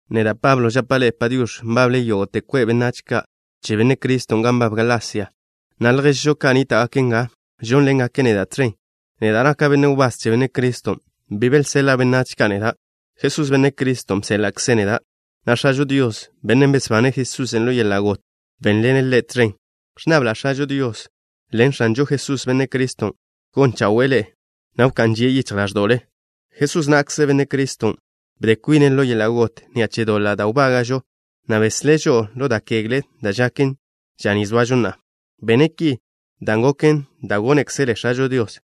Neda', Pablo, žapa' ḻe'e “Padiox̱” nbable yógo'te kwe' benách ka' che Benne' Cristo gan nbab Galasia, na' lježžo ka' nníta'gake' nga, žónḻengake' neda' tẕen. Neda' naka' benne' wbás che Benne' Criston'. Bi belseḻa' benách ka' neda'. Jesús, Benne' Criston', bséḻa'kze' neda', na' X̱ažo Dios, Bennen' besbane' Jesusen' ḻo yeḻa' got, bénḻene' Ḻe' tẕen. Ẕnnabla' X̱ažo Dios ḻen X̱anžo Jesús, Benne' Criston', gon chawe'e ḻe'e, na' wká'n žie' yichj ḻáẕdo'le. Jesús na'kze, Benne' Criston', bde kwine' ḻo yeḻa' got ni'a che doḻa' da' wbága'žo, na' beslé' žo'o ḻo da' kegle da' žaken ža ni zoažo na'a. Bene' ki dan' goken da' gónekzele X̱ažo Dios.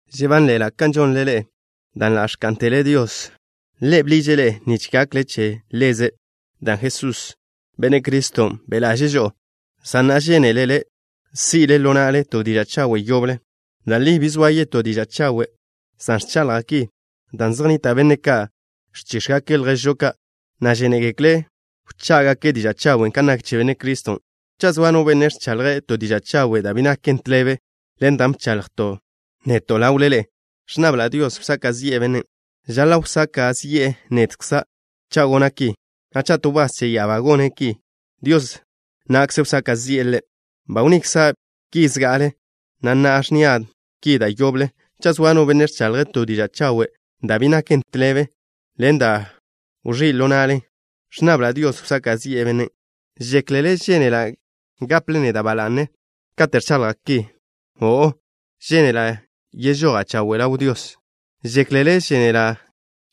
Žebánḻe'ela' kan žonle ḻe'e, dan' ḻa' ẕká'ntele Dios. Ḻe' bḻiže' ḻe'e nich gakle che Ḻeze' dan' Jesús, Benne' Criston', be' ḻaže'e žo'o, san na'a žénelele si' ḻo na'le to diža' chawe' yoble. Da' li bi zoa yetó diža' chawe' san ẕchaḻja' ki dan' zej nnita' benne' ka' ẕchíx̱gake' lježžo ka', na' žénegekle' wchá'gake' diža' chawen' kan nak che Benne' Criston'. Cha' zoa no benne' ẕchaḻje' to diža' chawe' da' bi naken tḻebe ḻen dan' bchaḻjto' neto' ḻawle ḻe'e, ẕnnabla' Dios wsaka' zi'e bennen'. Žaḻa' wsaka' zi'e nedkza' cha' gona' ki, na' cha' to wbás che ya'abá gone' ki, Dios na'kze wsaka' zi'e ḻe'. Ba wnnikza' ki zga'ale, na' na'a ẕnnia' ki da' yoble: cha' zoa no benne' ẕchaḻje' to diža' chawe' da' bi naken tḻebe ḻen dan' ba wẕí' ḻo na'len, ẕnnabla' Dios wsaka' zi'e bennen'. ¿Žéklele žénela' gaple neda' ba la'ne kate' ẕchaḻja' ki? O'o. Žénela' yežoja' chawe' ḻaw Dios. ¿Žéklele žénela'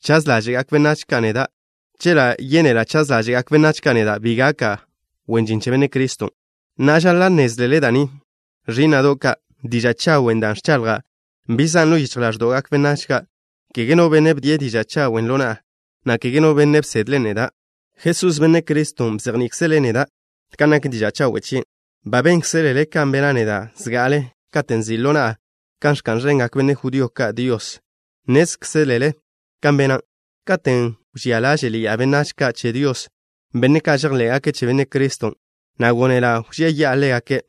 chaz ḻáže'gak benách ka' neda'? Chela' yénela' chaz ḻáže'gak benách ka' neda', bi gaka' wen žin che Benne' Criston'. Na'a, žaḻa' nnézlele da' ni, ẕí'na'do' ka'. Diža' chawen' dan' ẕchaḻja' bi zan' ḻo yichj ḻáẕdo'gak benách ka'. Kege no benne' bdie' diža' chawen' ḻo na'a, na' kege no benne' bsedḻen' neda'. Jesús, Benne' Criston', bzejní'ikzele' neda' kan nak diža' chawe' chien'. Ba bénkzelele kan bena' neda' zga'ale katen' nzi' ḻo na'a kan ẕka'n ẕengak benne' judío ka' Dios. Nnézkzelele kan bena', katen' wžía ḻáže'ḻi'a benách ka' che Dios, benne' ka' žejḻé'gake' che Benne' Criston', na' gónela' wžía yi'a ḻégake'.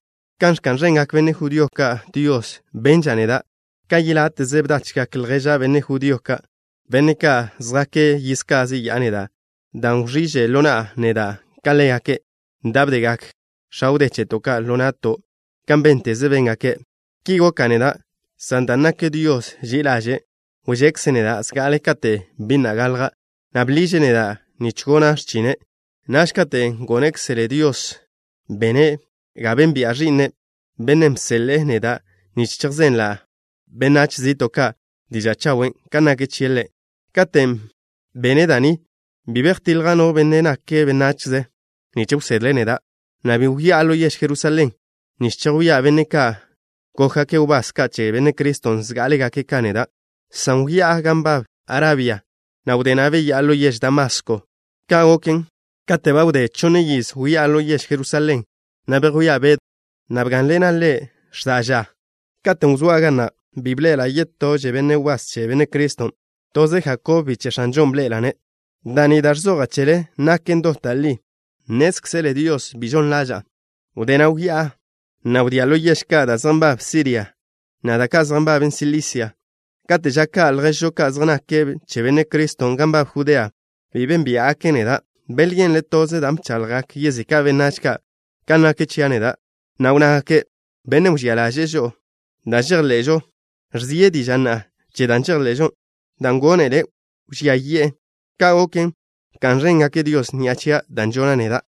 Kan ẕka'n ẕengak benne' judío ka' Dios, benža' neda' ka yeláte'ze bdachgak lježa' benne' judío ka', benne' ka' zjake' yiz ka zeyá'a neda', dan' wẕí'že ḻo na'a neda' ka ḻégake' da' bdegak x̱a wdé cheto' ka' ḻo na'to' kan bénteze béngake'. Ki goka' neda', san dan' nak Dios ži'i ḻaže', wžekze' neda' zga'ale kate' bi na' galja', na' bḻiže' neda' nich gona' x̱chine'. Naž, katen' gónekzele Dios, bene' ga bénbi'a Ẕi'ne', Bennen' bseḻe'e neda' nich chejzenla' benách zi'to' ka' diža' chawen' kan nak chie' Ḻe'. Katen' bene' da' ni, bi bejtiḻja' no benne' nake' benachze nich wsedle' neda', na' bi wyá'a ḻo yež Jerusalén nich chejwía' benne' ka' gókgake' wbás ka' che Benne' Criston' zgá'alegake' ka neda', san wyá'a gan nbab Arabia, na' wdé na' beyá'a ḻo yež Damasko. Ka' goken, katen' ba wdé chonne yiz wyá'a ḻo yež Jerusalén, na' bejwía' Bedw, na' bgá'nḻena' ḻe' x̱da' ža. Katen' wzóa' ga na' bi bḻe'ela' yetože benne' wbás che Benne' Criston'. Toze Jakob, biche' X̱anžon' bḻe'ela'-ne'. Da' ni da' ẕzoja' chele naken dot da' li. Nnézkzele Dios bi žon ḻaža'a. Wdé na' wyá'a, na' wdía' ḻo yež ka' da' zej nbaben Siria, na' da' ka' zej nbaben Silisia. Kate' ža ka' lježžo ka' zej nake' che Benne' Criston' gan nbab Judea bi bénbia'gake' neda'. Belyenle' toze dan' bchaḻjgak yezika' benách ka' kan nak chia' neda', na' wnnágake': “Bennen' wžía ḻaže'e žo'o zga'ale, ẕze diže'e na'a che da' žejḻe'žo, dan' gónele' wžía yi'e.” Ka' goken, bka'n ẕéngake' Dios ni'a che da' žona' neda'.